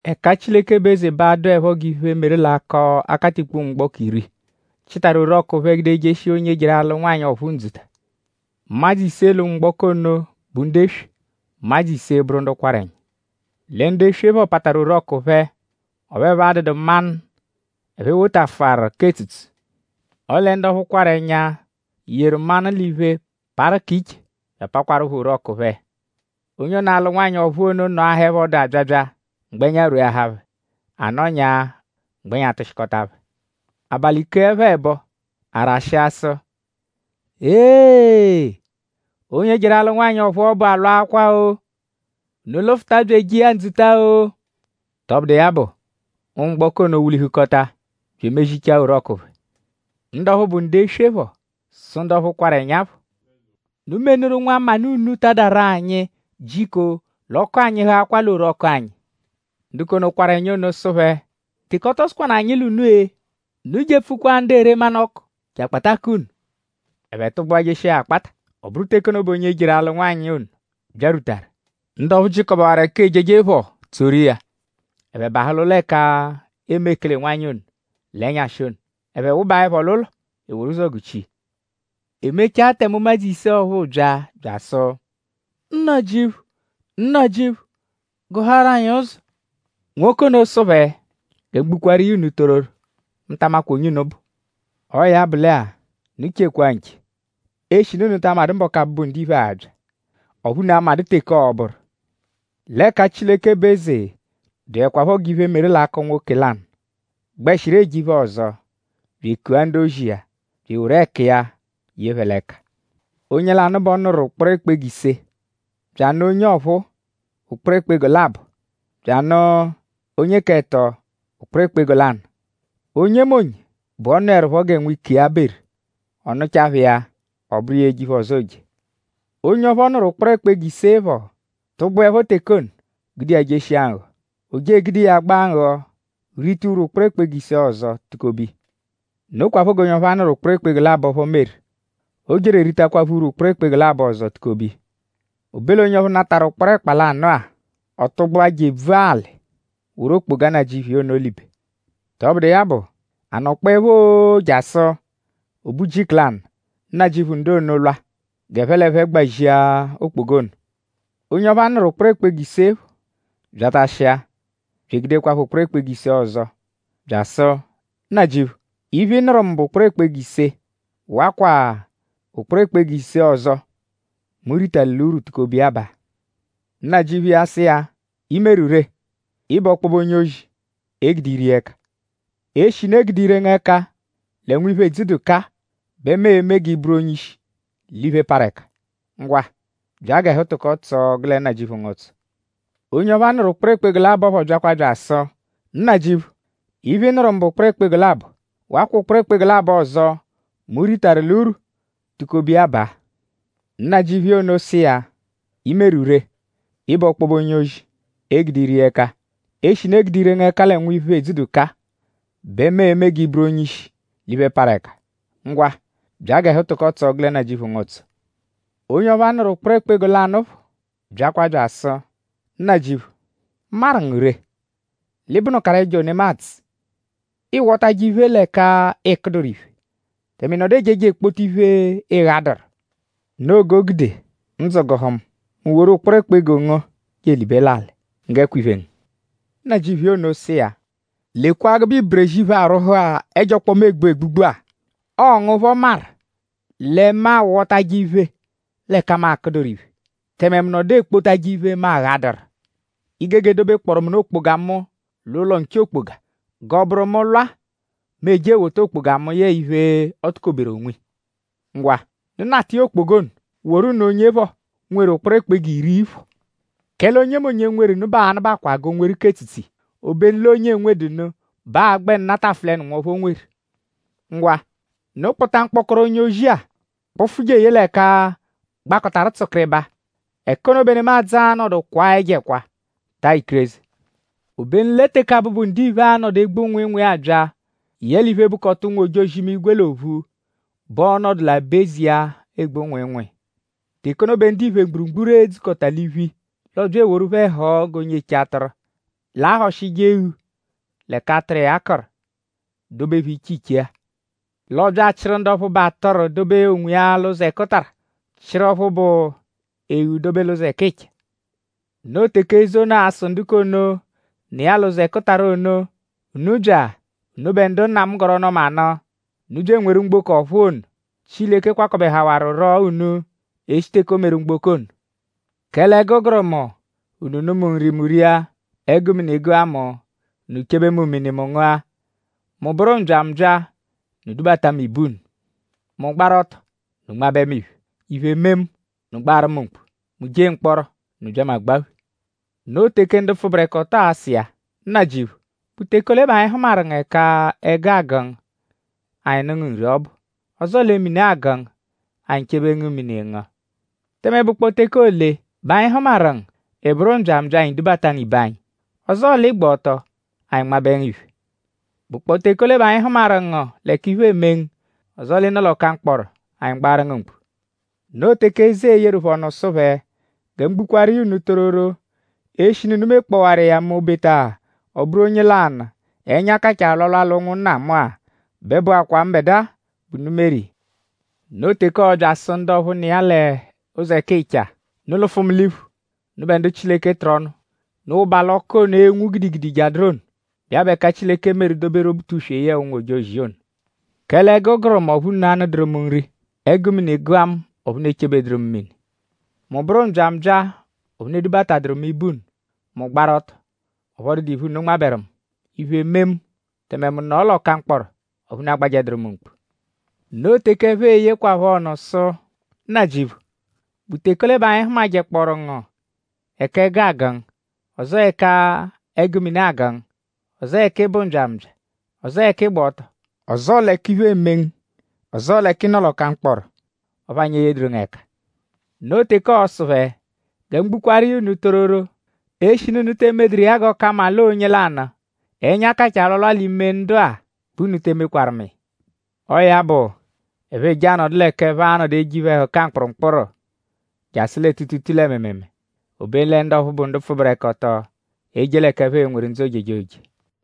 “Ẹka Chileke bụ eze bẹ aa-dụepho g'iphe, meru l'akọ akatikpo ụnwumgboko iri, chịtaru orọku phẹ gude jeshia onye jeru alụ nwanyị ọ̀phúú ndzuta. Ụmadzu ise l'ụnwumgboko ono bụ ndu eswe; ụmadzu ise bụru ndu kwarụ ẹnya. Lẹ ndu eswe phọ pataru orọku phẹ; ọphu ẹphe adụdu manụ, ẹphe wotafụaru k'etsutsu. Ọle ndu ọphu kwarụ ẹnya yeru manụ l'iphe parụ k'iche bya apakwaruphọ orọku phẹ. Onye ono, alụ nwanyị ọ̀phúú ono nọahaepho ọdu abyabya; mgbẹnya rweahaa phẹ. A nọnya; mgbẹnya tụshikota phẹ. “Abalị keẹpho ẹbo; a rashịa sụ: ‘Eeghee! Onye jeru alụ nwanyị ọ̀phúú ọbu alwaakwa-o! Unu lụfuta bya eje iya ndzuta-o!’ Tọbudu iya bụ; ụnwumgboko ono wulihukọta bya emezichaa orọku phẹ. Ndu ọphu bụ ndu eswe phọ sụ ndu ọphuu, kwarụ ẹnya phọ: ‘Unu menuru nwamanụ unu tadaru anyi jiko l'ọku anyịhuakwaa l'orọku anyi.’ Ndu k'ono, kwarụ ẹnya ono sụ phẹ: ‘?Teke ọ tọ sụkwanu anyi l'unu-e? Unu jepfukwa ndu ere manụ-ọku je akpata k'unu.’ Ẹphe tụgbua jeshia ya akpata. Ọ bụru teke ono bẹ onye jeru alụ nwanyị ono byarwutaru; ndu ọphu jịkobewaru ẹka ejeje phọ tsoru iya; ẹphe bahụ l'ụlo ẹka eeme ekele-nwanyị ono l'ẹnyashi ono. Ẹphe wụbaepho l'ụlo; e woru ụzo guchia. “E mechaa tẹme ụmadzu ise ọphuu bya; bya asụ: ‘Nnajịuphu! Nnajịuphu! Gụhaaru anyi ụzo.’ Nwoke ono sụ phẹ: ‘Gẹ mu gbukwaaru iya unu tororo; mu ta amakwa onye unu bụ.’” Ọo ya bụ lẹ-a; unu chekwa nche; eshinu unu ta amadụ mbọku, Abụbu-Ndiphe a-bya; ọphu unu amadụ teke ọo-bụru. “L'ẹka Chileke bụ eze dụekwapho g'iphe, meru l'akọ nwoke lanụ, gbẹshiru eje iphe-ọzo; bya ekua ndu-ozi iya bya eworu ẹku iya ye phẹ l'ẹka. Onye lanụ bẹ ọ nụru ụkporo ẹkpa-ego ise; bya anụ onye ọphuu ụkporo ẹkpa-ego labọ; bya anụ onye k'ẹto ụkporo ẹkpa-ego lanụ. Onyemonye bẹ ọ nụerupho gẹ nwike nkiya beru. Ọ nụchaa phẹ iya; ọ bụru iya eje iphe-ọzo, ooje. Onye ọphu ọ nụru ụkporo ẹkpa-ego ise phọ tụgbuepho teke ono gude iya jeshia nghọ. O je egude iya gbaa nghọ rita urwu ụkporo ẹkpa-ego ise ọzo tukobe iya. Nokwaphọ g'onye ọphu a nụru ụkporo ẹkpa-ego labọ phọ meru. O jeru eritakwaphọ urwu ụkporo ẹkpa-ego labọ ọzo tukobe iya. O be l'onye ọphu natarụ ụkporo ẹkpa lanụ-a; ọ tụgbua je ebvua alị woru okpoga nnajịuphu iya ono libe. “Tọbudu iya bụ; a nọkpoepho-oo jasụ: o be ujiku lanụ; nnajịuphu ndu ono lwa g'ẹphe l'ẹphe gbazia okpoga ono. Onye ọphu a nụru ụkporo ẹkpa-ego ise phọ byatashia bya egudekwaphọ ụkporo ẹkpa-ego ise ọzo bya asụ: ‘Nnajịuphu; iphe, ị nụru mu bụ ụkporo ẹkpa-ego ise. Wakwa ụkporo ẹkpa-ego ise ọzo, mu ritaru l'urwu tukobe iya baa.’ Nnajịuphu iya sụ iya: ‘I meru ree! Ị bụ ọkpobe onye-ozi, e gude ire iya ẹka. Eshinu e gude ire ngu ẹka lẹ nwiphe, edzudu kaa bẹ mu e-me g'ị bụru onye-ishi l'iphe, parụ ẹka. Ngwa; bya g'ẹhu tụko tsọo gụ lẹ nnajịuphu ngu ụtso.’ Onye ọphuu, a nụru ụkporo ẹkpa-ego labọ phọ byakwa bya asụ: ‘Nnajịuphu; iphe, ị nụru mu bụ ụkporo ẹkpa-ego labọ. Wakwa ụkporo ẹkpa-ego labọ ọzo, mu ritaru l'urwu tukobe iya baa.’ Nnajịuphu iya ono sụ iya: ‘I meru ree. Ị bụ ọkpobe onye-ozi, e gude ire iya ẹka. Eshinu e gude ire ngu ẹka lẹ nwiphe, edzudu kaa bẹ mu e-me g'ị bụru onye-ishi l'iphe, parụ ẹka. Ngwa; bya g'ẹhu tụko tsọo gụ lẹ nnajịuphu ngu ụtso.’ Onye ọphu a nụru ụkporo ẹkpa-ego lanụ phọ byakwa bya asụ: ‘Nnajịuphu; mu maru ngu ree; l'ị bụnukaru ẹjo nemadzụ. Ịiwotaje iphe l'ẹka ị kụduru iphe; tẹme ị nọdu ejeje ekpota iphe, ị ghadụru. Noo g'o gude ndzụ gụhu mu; mu woru ụkporo ẹkpa-ego ngu je elibe l'alị. Nggẹkwa iphe ngu.’ “Nnajịuphu iya ono sụ iya: ‘Lekwa gụbe iberezi iphe, arwụhu-a, ẹjo ọkpoma egbu egbugbu-a. Ọo ngu phọ maru lẹ mu awọtaje iphe l'ẹka mu akụduru iphe; tẹme mu nọdu ekpotajẹ iphe, mu aghaduru. I gege dobekpọoru mu nụ okpoga mu l'ụlo nche okpoga; g'ọo-bụru mu -lwa mu eje ewota okpoga mu yẹe iphe, o tukoberu onwiya. Ngwa; unu nata iya okpoga ono; woru nụ onye phọ, nweru ụkporo ẹkpa-ego iri phọ. Kẹle onyemonye, nweru nụ bẹ aa-nụbakwa g'o nweru k'etsutsu iya. Obenu l'onye enwedu nụ bẹ aa-gbẹnu natafụlenu nwọphu o nweru.’ ‘Ngwa; unu kpụta mkpọkoro onye-ozi-a kpụfu je eye l'ẹka gbakọtaru tsụkiribaa. Ẹka ono bẹ nemadzụ a-nọdu kwaa ẹjo ẹkwa; taa ikireze.’” “Obenu lẹ teke Abụbu-Ndiphe a-nọdu egbu nwịinwii abya yẹe iphe, bụkota ụnwu-ojozi-imigwe l'ophu bẹ ọo-nọdu l'aba-eze iya, egbu nwịinwii. Teke ono bẹ ndiphe mgburugburu e-dzukọta l'iphu iya. L'ọobya eworu phẹ họo g'onye eche atụru, l'ahọshije eghu l'ẹka atụru iya kụru; dobe phẹ iche iche-a. L'ọobya achịru ndu ọphu bụ atụru dobe onwiya l'ụzo ẹkutara; chịru ọphu bụ eghu dobe l'ụzo ẹkicha. Noo teke eze ono a-sụ ndu k'ono, nọ iya l'ụzo ẹkutara ono: ‘Unu bya; unubẹ ndu Nna mu gọru ọnu-ọma nụ. Unu bya enweru mgboko ọ̀phúú ono, Chileke kwakọbehawaruro unu e -shi teke o meru mgboko ono. Kẹle ẹgu gụru mu; unu nụ mu nri; mu ria. Ẹgu mini gụa mu; unu chebe mu mini; mu ngụa. Mu bụru mbyambya; unu dubata mu ibe unu. Mu gbaru ọto; unu nmabẹ mu iphe. Iphe mee mu; unu gbaaru mu mkpu. Mu jee mkpọro; unu bya mu agbaphe.’ “Noo teke ndu pfụberekoto a-sụ iya: ‘Nnajịuphu;?bụ teke ole bẹ anyi hụmaru ngu ẹka ẹgu agụ ngu; anyi nụ ngu nri ọbu? Ọzoo lẹ mini agụ ngu; anyi chebe ngu mini; ị ngụa? Tẹme?bụkpoo teke ole bẹ anyi hụmaru ngu; ị bụru mbyambya; anyi dubata ngu ibe anyi? Ọzoo l'ị gba ọto; anyi nmabẹ ngu iphe? ?Bụkpoo teke ole bẹ anyi hụmaru ngu l'ẹka iphe eme ngu; ọzoo l'ị nọ l'ọka mkpọro; anyi gbaaru ngu mkpu?’ Noo teke eze e-yeru phẹ ọnu sụ phẹ: ‘Gẹ mu gbukwaaru iya unu tororo; eshinu unu mekpọwaru iya m'obeta ọ bụru onye lanụ, ẹnya kachaa alwalwa l'ụnwunna mu-a bẹ bụakwaa mbẹdua bẹ unu meru iya.’ “Noo teke ọo-bya asụ ndu ọphu nọ iya l'ụzo ẹkicha: ‘Unu lụfu mu l'iphu; unubẹ ndu Chileke tụru ọnu. Unu wụba l'ọku ono, e-nwu gidigidi jadụru ono, bụ iya bụ ẹka Chileke meru doberu Obutuswe yẹe ụnwu-ojozi iya ono. Kẹle ẹgu gụru mu; ọphu unu anụduru mu nri. Ẹgu mini gụa mu; ọphu unu echebeduru mu mini. Mu bụru mbyambya; ọphu unu edubataduru mu ibe unu. Mu gbaru ọto; ọphu ọ dụdu iphe, unu nmabẹru mu. Iphe mee mu; tẹme mu nọo l'ọka mkpọro; ọphu unu agbajẹduru mu mkpu.’ Noo teke ẹphe e-yekwaphọ ọnu sụ: ‘Nnajịuphu;?bụ teke ole be anyi hụmajekpooru ngu ẹka ẹgu agụ ngu; ọzoo ẹka ẹgu mini agụ ngu; ọzoo ẹka ị bụ mbyambya; ọzoo ẹka ị gba ọto; ọzoo l'ẹka iphe eme ngu; ọzoo l'ẹka ị nọ l'ọka mkpọro; ọphu anyi eyeduru ngu ẹka?’ Noo teke ọo-sụ phẹ: ‘Gẹ mu gbukwaaru iya unu tororo; eshinu unu te emeduru iya g'ọ ka mma l'ọo onye lanụ, ẹnya kachaa alwalwa l'ime ndu-a bẹ unu te emekwaru mu iya.’ Ọo ya bụ; ẹphe eje anọdu l'ẹka ẹphe a-nọdu eje iphe-ẹhuka mkpụrumkpuru jasụ lẹ tuutuutuu lẹ mịimiimii. Obenu lẹ ndu ọphu bụ ndu pfụberekoto e-je l'ẹka ẹphe e-nweru ndzụ ojejoje.”